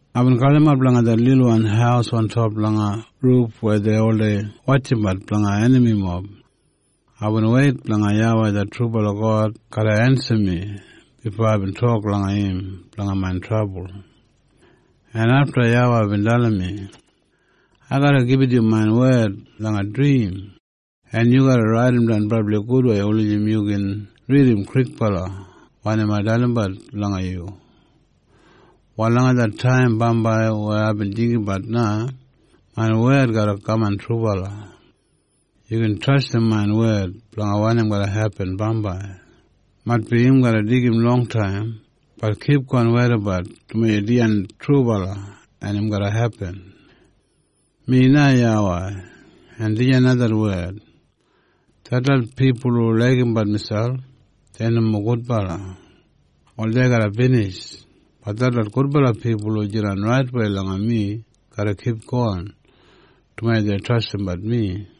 Aibin galimap langa det lilwan haus ontop langa ruf weya dei oldei wotjimbat blanga enamimob. Aibin weit blanga YAWEI det trubala God garra ensim mi bifo aibin tok langa im blanga main trabul. En afta YAWEI bin dalim mi, “Ai garra gibit yu main wed langa drim, en yu garra raidimdan brabli gudwei wulijim yu gin ridim kwikbala wanim ai dalimbat langa yu. Wal langa det taim bambai weya aibin jinggabat na, main wed garra kaman trubala. Yu gin trastim main wed blanga wanim garra hepin bambai. Maitbi im garra deigim longtaim, bat kipgon weidabat dumaji dijan trubala en im garra hepin. “Mi na YAWEI, en dijan na det wed. Detlot pipul hu laigimbat miselp, dei nomo gudbala. Wal dei garra binij. Bat detlot gudbala pipul hu jidan raitwei langa mi garra kipgon, dumaji dei trastimbat mi.”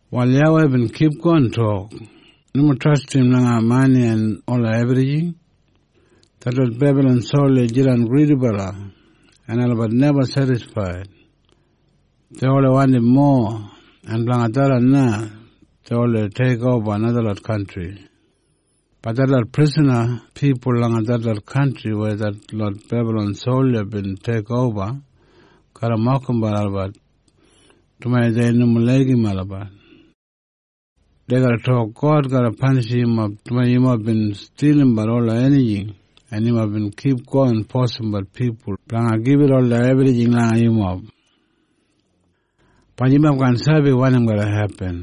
Wal YAWEI bin kipgon tok, “Nomo trastim langa mani en ola ebrijing. Detlot Bebalon solja jidan gridibala en olabat neba sedisfaid. Dei oldei wandim mowa. En blanga tharran na dei oldei teikoba najalot kantri. “Bat detlot prisana pipul langa detlot kantri weya detlot Bebalon solja bin teikoba garra mokimbat olabat dumaji dei nomo laigim olabat. Dei garra tok, ‘God garra panishim yumob dumaji yumob bin stilimbat ola enijing en yumob bin kipgon fosimbat pipul blanga gibit ola ebrijing langa yumob.’ “Bat yumob kaan sabi wanim garra hepin.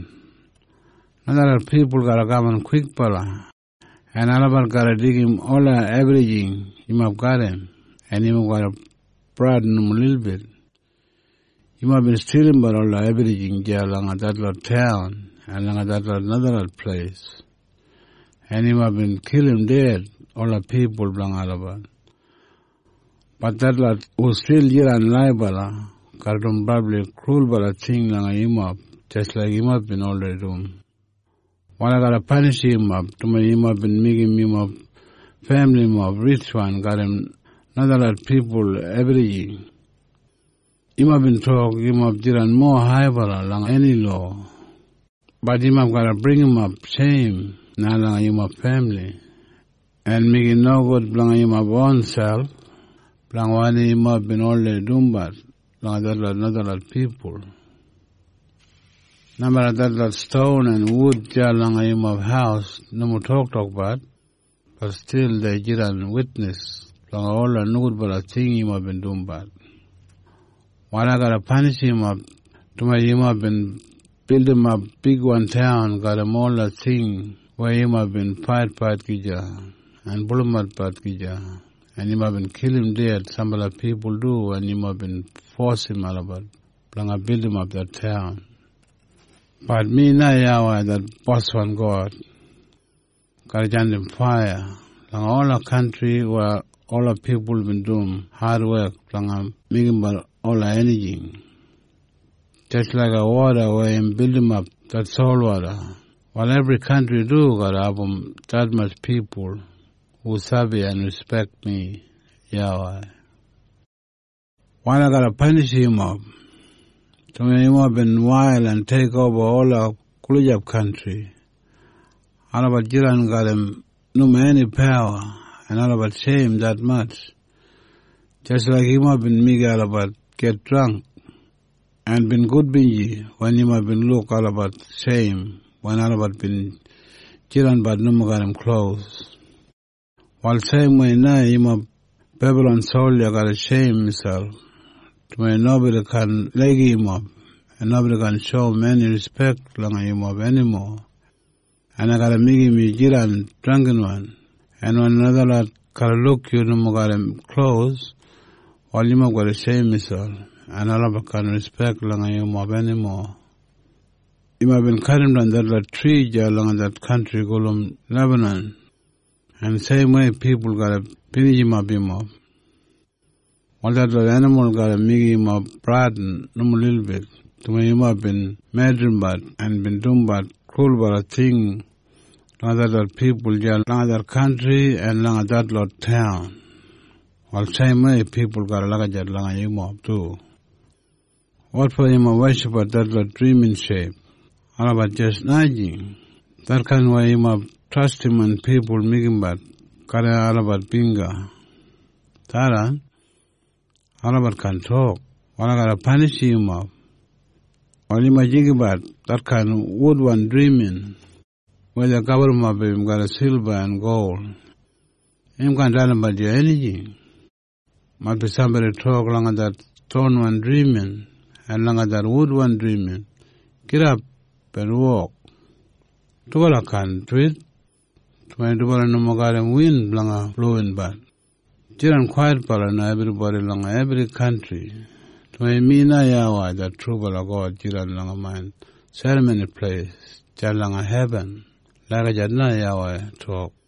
Najalot pipul garra kaman kwikbala en olabat garra deigim ola ebrijing yumob garram, en yumob garra bradin nomo lilbit. Yumob bin stilimbat ola ebrijing deya langa detlot taun en langa detlot najalot pleis, en yumob bin kilim ded ola pipul blanga olabat. Bat detlot hu stil jidan laibala garra dum brabli krulbala ting langa yumob jis laik yumob bin oldei dum. “Wal ai garra panishim yumob, dumaji yumob bin meigim yumob femilimob ritjwan garram najalot pipul ebrijing. Yumob bin tok yumob jidan mowa haibala langa eni lowa. Bat yumob garra bringimap sheim na langa yumob femili, en meigim nogud blanga yumob ronselp blanga wanim yumob bin oldei dumbat langa detlot najalot pipul. Nomeda detlot ston en wud deya langa yumob haus nomo toktokbat, bat stil dei jidan witnis blanga ola nogudbala ting yumob bin dumbat. “Wal ai garra panishim yumob dumaji yumob bin bildimap bigwan taun garram ola ting weya yumob bin faitfait gija en pulumatbat gija en yumob bin kilim ded sambala pipul du wen yumob bin fosim olabat blanga bildimap det taun. Bat mi na YAWEI det boswan God, garra jandim faiya langa ola kantri weya ola pipul bin dum adwek blanga meigimbat ola enijing. Jis laiga woda weya im bilimap det solwoda, wal ebri kantri du garra abum detmatj pipul hu sabi en rispek mi na. “Wal ai garra panishim yumob. Dumaji yumob bin wail en teikoba ola gulijap kantri, olabat jidan garram nomo eni pawa en olabat sheim detmatj, jis laik yumob bin meigim olabat git drangk, en bin gudbinji wen yumob bin luk olabat sheim wen olabat bin jidanbat nomo garram klos. Wal seimwei na yumob Bebalon solja garra sheim miselp dumaji nobodi kaan laigim yumob en nobodi kaan shoum eni rispek langa yumob enimo, en ai garra meigim yu jidan drangginwan en wen najalot garra luk yu nomo garram klos wal yumob garra sheim miselp en olabat kaan rispek langa yumob enimo. Yumob bin kadimdan detlot tri deya langa det kantri gulum Lebanan, en seimwei pipul garra binijimap yumob. En ola enimul yumob bin oldei kilimbat, wal detlot enimul garra meigim yumob bradin nomo lilbit. Dumaji yumob bin medrimbat en bin dumbat krulbala ting langa detlot pipul deya langa det kantri en langa detlot taun, wal seimwei pipul garra lagijat langa yumob du. “Wotfo yumob weshipbat detlot drimin sheip? Olabat jis najing. Detkain weya yumob trastim wen pipul meigimbat garram olabat bingga, tharran, olabat kaan tok. Wal ai garra panishim yumob. Wal yumob jinggabat detkain wudwan drimin weya dei gaburrumap im garram silba en gol. Im kaan dalimbat yu enijing. Maitbi sambodi tok langa det stonwan drimin en langa det wudwan drimin, ‘Gidap en wok.’ Dubala kaan duwit, dumaji dubala nomo garram win blanga blowimbat. “Mi na YAWEI det trubala God. Yumob jidan kwaitbala na, ebribodi langa ebri kantri, dumaji mi jidan langa main Serramoni Pleis deya langa hebin.” Lagijat na YAWEI bin tok.